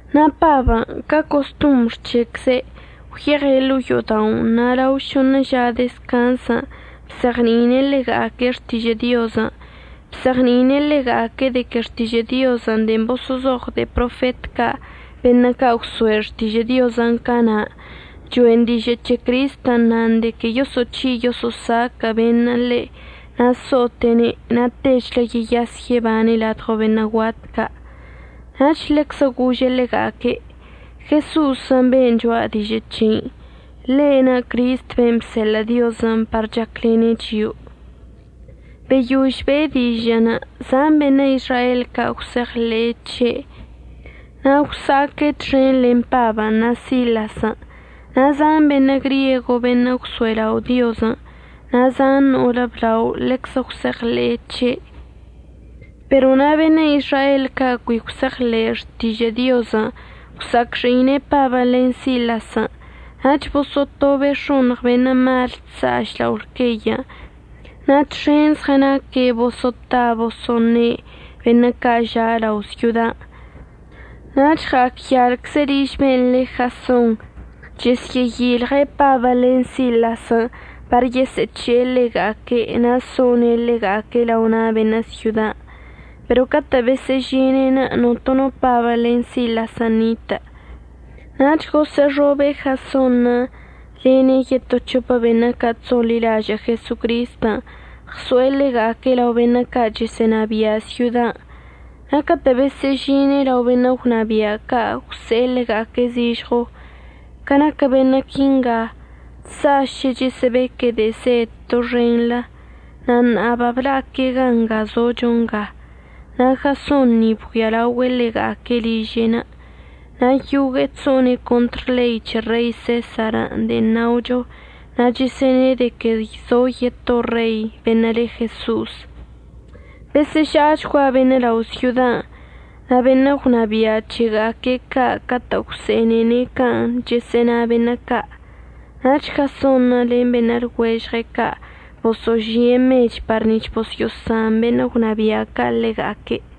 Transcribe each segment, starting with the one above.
Na' Pabən' ca costombr c̱hecze' gwyeɉe' ḻo'o yo'oda'onə' na' lao šoṉə ža dezcanz ca' bzeɉni'ine' ḻega'aque' xtižə' Diozən'. Bzeɉni'ine' ḻega'aque' de que Xtižə' Diozən' de'en boso'ozoɉ de'e profet ca' beṉə' ca' gwso'e xtižə' Diozən' cana' cho'en dižə' c̱he Cristən' nan de que yoso'oc̱hi' yoso'osaquə' beṉə' ḻe' na' so'ote'ene' na' techlə yeyas yebane' ladɉo beṉə' guat ca'. Nach ḻeczə gože' ḻega'aque': ―Jeso'osən' ben' cho'a dižə' c̱hei, ḻe'enə' Cristən' ben' bseḻə' Diozən' par chaclene' chio'o. Beyož be'e dižə'ənə' zan beṉə' Izrael ca' gwse'eɉḻe'e c̱he' na' gwsa'aque' txen len Pabən' na' Silasən', na' zan beṉə' griego beṉə' gwso'elao' Diozən' na' zan no'olə blao ḻeczə gwse'eɉḻe'e c̱he'. Pero na' beṉə' Izrael ca' cui gwse'eɉḻe'e xtižə' Diozən' gwsa'acxi'ine' Pabən' len Silasən' nach boso'otobe' x̱oṉɉ beṉə' mal chsa'aš lao lqueyən' na' txen zɉənaque' boso'ota boso'oṉe' beṉə' ca' ža' lao' syodan'. Nach ɉa'acyalcze' liž ben' le Jason chəsyə'əyilje' Pabən' len Silasən' par yesə'əc̱he'e ḻega'aque' na' so'one' ḻega'aque' lao na' beṉə' syodan'. Pero catə' besə'əžine'enə' notono Pabən' len Silasən' nitə'ənə'. Nach gosə'əxobe' Jasonṉə' lene' yeto c̱hopə beṉə' ca' chso'onḻilažə' Jesocristən' ɉso'e ḻega'aque' lao beṉə' ca' chəsə'ənabia' syodan'. Na' catə' besə'əžine' lao beṉə' gwnabia' ca' gwse'e ḻega'aque' zižɉo: ―Ca naquə beṉə' quinga chsa'aše' chəsə'əbeque' de'e zed doxenḻə na' ṉa'a babla'aque' gan' nga zocho nga. Na' Jason ni babgüialaogüe' ḻega'aque' liže'enə', na' yogue'e chso'one' contr ḻei c̱he Rei Sesar de'en naocho na' chəsə'əne' de que zo yeto rei beṉə' le Jeso'os. Besə'əža'achgua beṉə' lao' syodan' na' beṉə' gwnabia' c̱hega'aque' ca' catə' gwse'enene' can' chəsə'əna beṉə' ca'. Nach Jasonṉə' len beṉə' lɉuežɉe' ca' boso'ožie' mech par nic̱h bosyo'osan beṉə' gwnabia' ca' ḻega'aque'.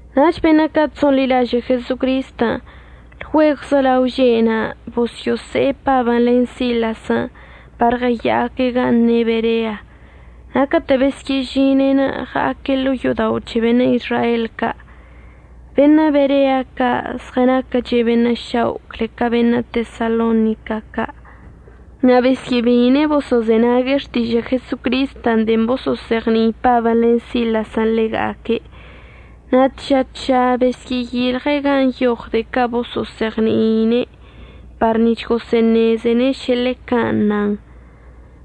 Nach beṉə' ca' chso'onḻilažə' Jesocristən' lgüegwzə lao že' na' bosyo'ose'e Pabən' len Silasən' par ɉəya'aque' gan' ne' Berea. Na' catə' besyə'əžine'enə' ɉa'aque' ḻo'o yo'odao' c̱he beṉə' Izrael ca'. Beṉə' Berea ca' zɉənaquəche' beṉə' šao' cle ca beṉə' Tesalonica ca' na' besyə'əbeine' boso'ozenague' xtižə' Jesocristən' de'en boso'ozeɉni'i Pabən' len Silasən' ḻega'aque', na' tža tža besyə'əyilɉe' gan' nyoɉ de'e ca' boso'ozeɉni'ine' par nic̱h gosə'əṉezene' šə ḻe can' nan.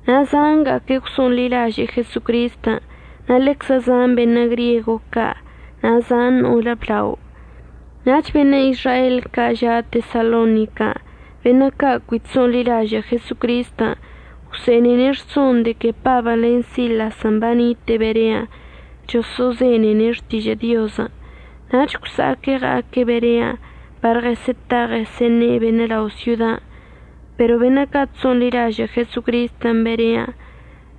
Na' zanga'aque' gwso'onḻilaže'e Jesocristən', na' ḻeczə zan beṉə' griego ca' na' zan no'olə blao. Nach beṉə' Izrael ca' ža' Tesalonican' beṉə' ca' cui chso'onḻilažə' Jesocristən', gwse'enene' rson de que Pabən' len Silasən' banite'e Berean' choso'ozenene' xtižə' Diozən'. Nach gwsa'aque' ɉa'aque' Berean' par ɉəsə'əta ɉəsə'əṉe' beṉə' lao' syodan'. Pero beṉə' ca' chso'onḻilažə' Jesocristən' Berean'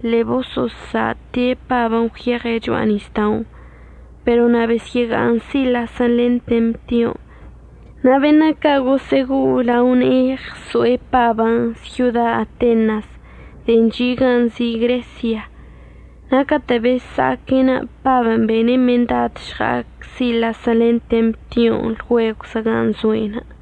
ḻe'e boso'osa'ate' Pabən' gwyeɉe' cho'a nisda'onə' pero na' besyə'əga'aṉ Silasən' len Temtion'. Na' beṉə' ca' gosə'əgo'o lao ne'e ɉso'e Pabən' syoda Atenas de'en chi' gan' nzi' Gresia. Na' catə' besa'aque'enə' Pabən' bene' mendad əžɉa'ac Silasən' len Temtion' lgüegwzə gan' zoe'enə'.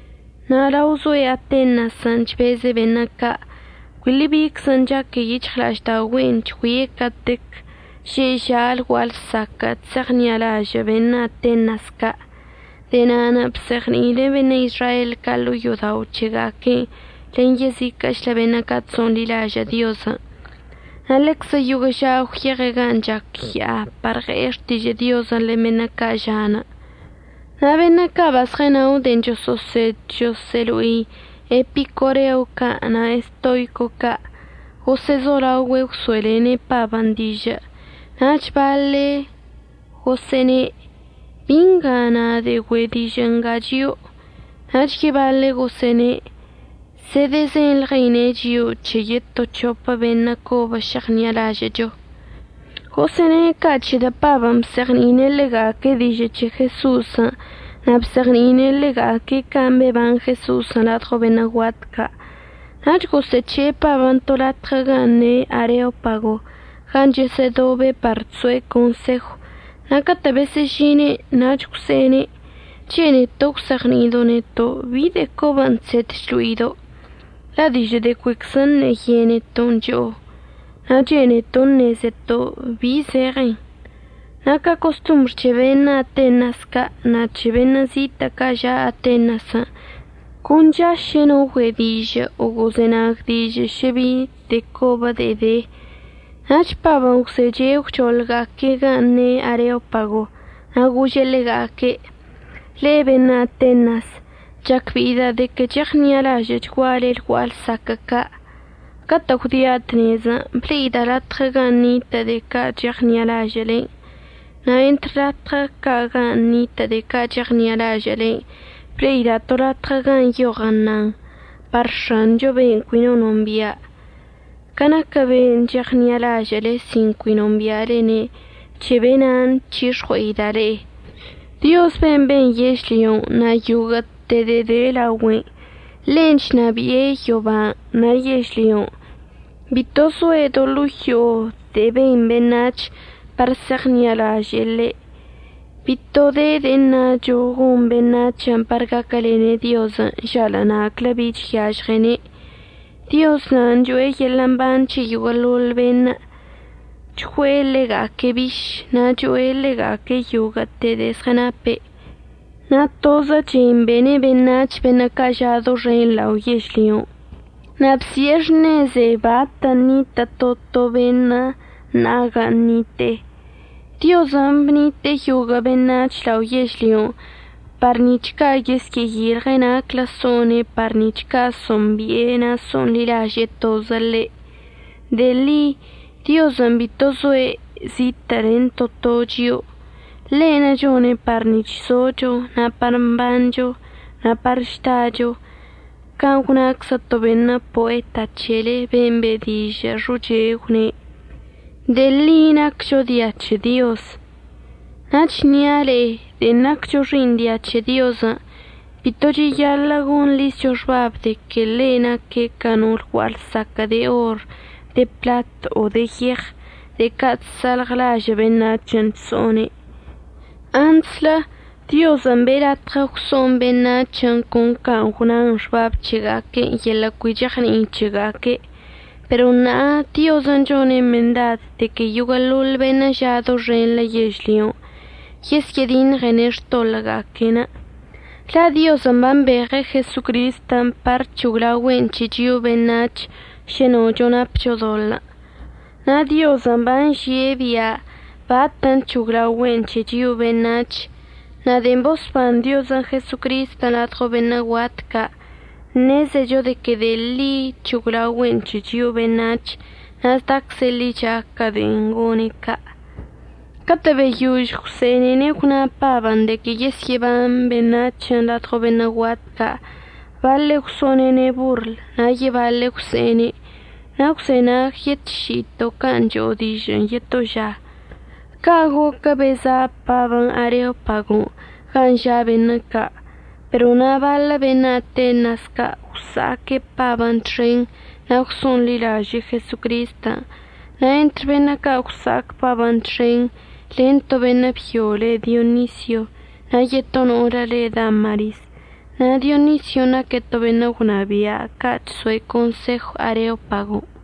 Na' lao zoe' Atenasən' chbeze' beṉə' ca', cuili biczən' chaque yic̱hɉla'aždaogüe'enə' chgüie' catequən' že'e ža' lgua'a lsaquən' chse'eɉṉi'alažə' beṉə' Atenas ca'. De'e na'anə' bzeɉni'ine' beṉə' Izrael ca' ḻo'o yo'odao' c̱hega'aque'enə' len yeziquə'əchlə beṉə' ca' chso'onḻilažə' Diozən'. Na' ḻeczə yoguə' ža gwyeɉe' gan' chac ya'a par ɉe'e xtižə' Diozən' len beṉə' ca' ža'anə'. Na' beṉə' ca' bazɉənao de'en choso'osed choso'olo'i epicoreo ca' na' estoico ca' gosə'əzolaogüe' gwso'elene' Pabən' dižə'. Nach baḻe' gosə'əṉe': ―¿Bi nga əṉa de'e güe' dižə' nga chio'o? Nach yebaḻe' gosə'əne': ―Zedəzenḻɉeine' chio'o c̱he yeto c̱hopə beṉə' cobən' šeɉṉi'alažə'əcho. Gosə'əne' ca' c̱hedə' Pabən' bzeɉni'ine' ḻega'aque' dižə' c̱he Jeso'osən' na' bzeɉni'ine' ḻega'aque' can' beban Jeso'osən' ladɉo beṉə' guat ca'. Nach gosə'əc̱he'e Pabən' to latɉə gan' ne' Areopago gan' chesə'ədobe' par chso'e consejw na' catə' besə'əžine'enə' nach gwse'ene': ―Chene'eto' əgwzeɉni'ido' neto' bi de'e cobən' chsed chlo'ido'. La' dižə' de'e cuiczə ṉe'e yeneton' cho'o, na' chene'eto' əṉezeto' bi zeɉenṉə'. Na' ca costombr c̱he beṉə' Atenas ca' na' c̱he beṉə' zitə' ca' ža' Atenasən' con chaše' no güe' dižə' o gozenag dižə' šə bi de'e cobə de'e de. Nach Pabən' gwzeche' gwchoḻga'aque'enə' gan' ne' Areopagon' na' gože' ḻega'aque': ―Le'e beṉə' Atenas, chacbe'ida' de que cheɉṉi'alažə'əchguale lgua'a lsaquə' ca'. Catə' gwdia' tnezən' ble'ida' latɉə gan' nitə' de'e ca' cheɉṉi'alažə'əlen'. Na' entr latɉ ca' gan' nitə' de'e ca' cheɉṉi'alažə'əlen' ble'ida' to latɉə gan' nyoɉən nan: “Par X̱ancho be'enə' cui no nombia'”. Ca naquə be'enə' cheɉṉi'alažə'əle sin cui nombi'alene' c̱he be'ena'anə' əchyix̱ɉue'ida' le'e. Dioz ben' ben yežlyon' na' yoguə'əte de'e de laogüen', ḻen' chnabi'e yoban' na' yežlyon'. Bito zoe' do ḻo'o yo'o de'e ben beṉac̱hən' par se'eɉṉi'alaže'e ḻe'. Bito de de'e əṉacho gon beṉac̱hən' par gaquəlene' Diozən' žalə' na'aclə bi chyažɉene'. Dioz na'anə' cho'e yeḻə' mban c̱he yoguə'əḻoḻ beṉə', chgüe'e ḻega'aque' biš na' cho'e ḻega'aque' yoguə'əte de'e zɉənape'. Na' tozə chen bene' beṉac̱hən' beṉə' ža' doxen lao yežlyon'. Na' bsi'e xṉeze bat ṉitə' to to beṉə' na' gan' ṉite'e. Diozən' bnite'e yoguə' beṉac̱hən' lao yežlyon' par nic̱h ca' yesyə'əyilɉe' naclə so'one' par nic̱h ca' so'ombi'ene' na' so'onḻilaže'e tozə ḻe'. De'e ḻi Diozən' bito zoe' zitə' len to to chio'o. Ḻe'enə' chone' par nic̱h zocho na' par mbancho na' par chdacho, can' gwnaczə to beṉə' poeta c̱hele ben' be' dižə' xoche gwne': “De'e ḻi naccho dia c̱he Diozən'.” Na' əchnia' le'e de'en naccho xi'iṉ dia c̱he Diozən' bito cheyaḻə' gonḻizcho xbab de que ḻe' naque' ca no lgua'a lsaquə' de or, de pḻat o de yeɉ, de'e ca' chsa'alɉlažə' beṉac̱hən' chso'one'. Antslə Diozən' be'e latɉə gwso'on beṉac̱hən' con can' gwna xbab c̱hega'aque'enə' yeḻə' cui cheɉni'i c̱hega'aque'. Pero ṉa'a Diozən' chone' mendad de que yoguə'əḻoḻ beṉə' ža' doxenḻə yežlyon' yesyə'ədiṉɉene' xtoḻə'əga'aque'enə'. La' Diozən' bambeɉe' Jesocristən' par əc̱hoglaogüe'en c̱he chio'o beṉac̱h šə nocho napcho doḻə'. Na' Diozən' banžie' bia' batən' c̱hoglaogüe'en c̱he chio'o beṉac̱h. Na' de'en bosban Diozən' Jesocristən' ladɉo beṉə' guat ca' ṉezecho de que de'e ḻi c̱hoglaogüe'en c̱he chio'o beṉac̱h na' zdacze' ḻicha ca de'en gone' ca'. Catə' beyož gwse'enene' gwna Pabən' de que yesyə'əban beṉac̱hən' ladɉo beṉə' guat ca' baḻe' gwso'onene' borl na' yebaḻe' gwse'ene': ―Na' gwzenagyetši'ito' can' cho'o dižə'ənə' yetolə ža. Ca' goquə beza' Pabən' Areopagon' gan' ža' beṉə' ca'. Pero na' baḻə beṉə' Atenas ca' gwsa'aque' Pabən' txen na' gwso'onḻilaže'e Jesocristən'. Na' entr beṉə' ca' gwsa'ac Pabən' txen, len to beṉə' byo le Dionisio na' yeto no'olə le Damaris. Na' Dionision' naque' to beṉə' gwnabia' ca' chso'e consejon' Areopagon'.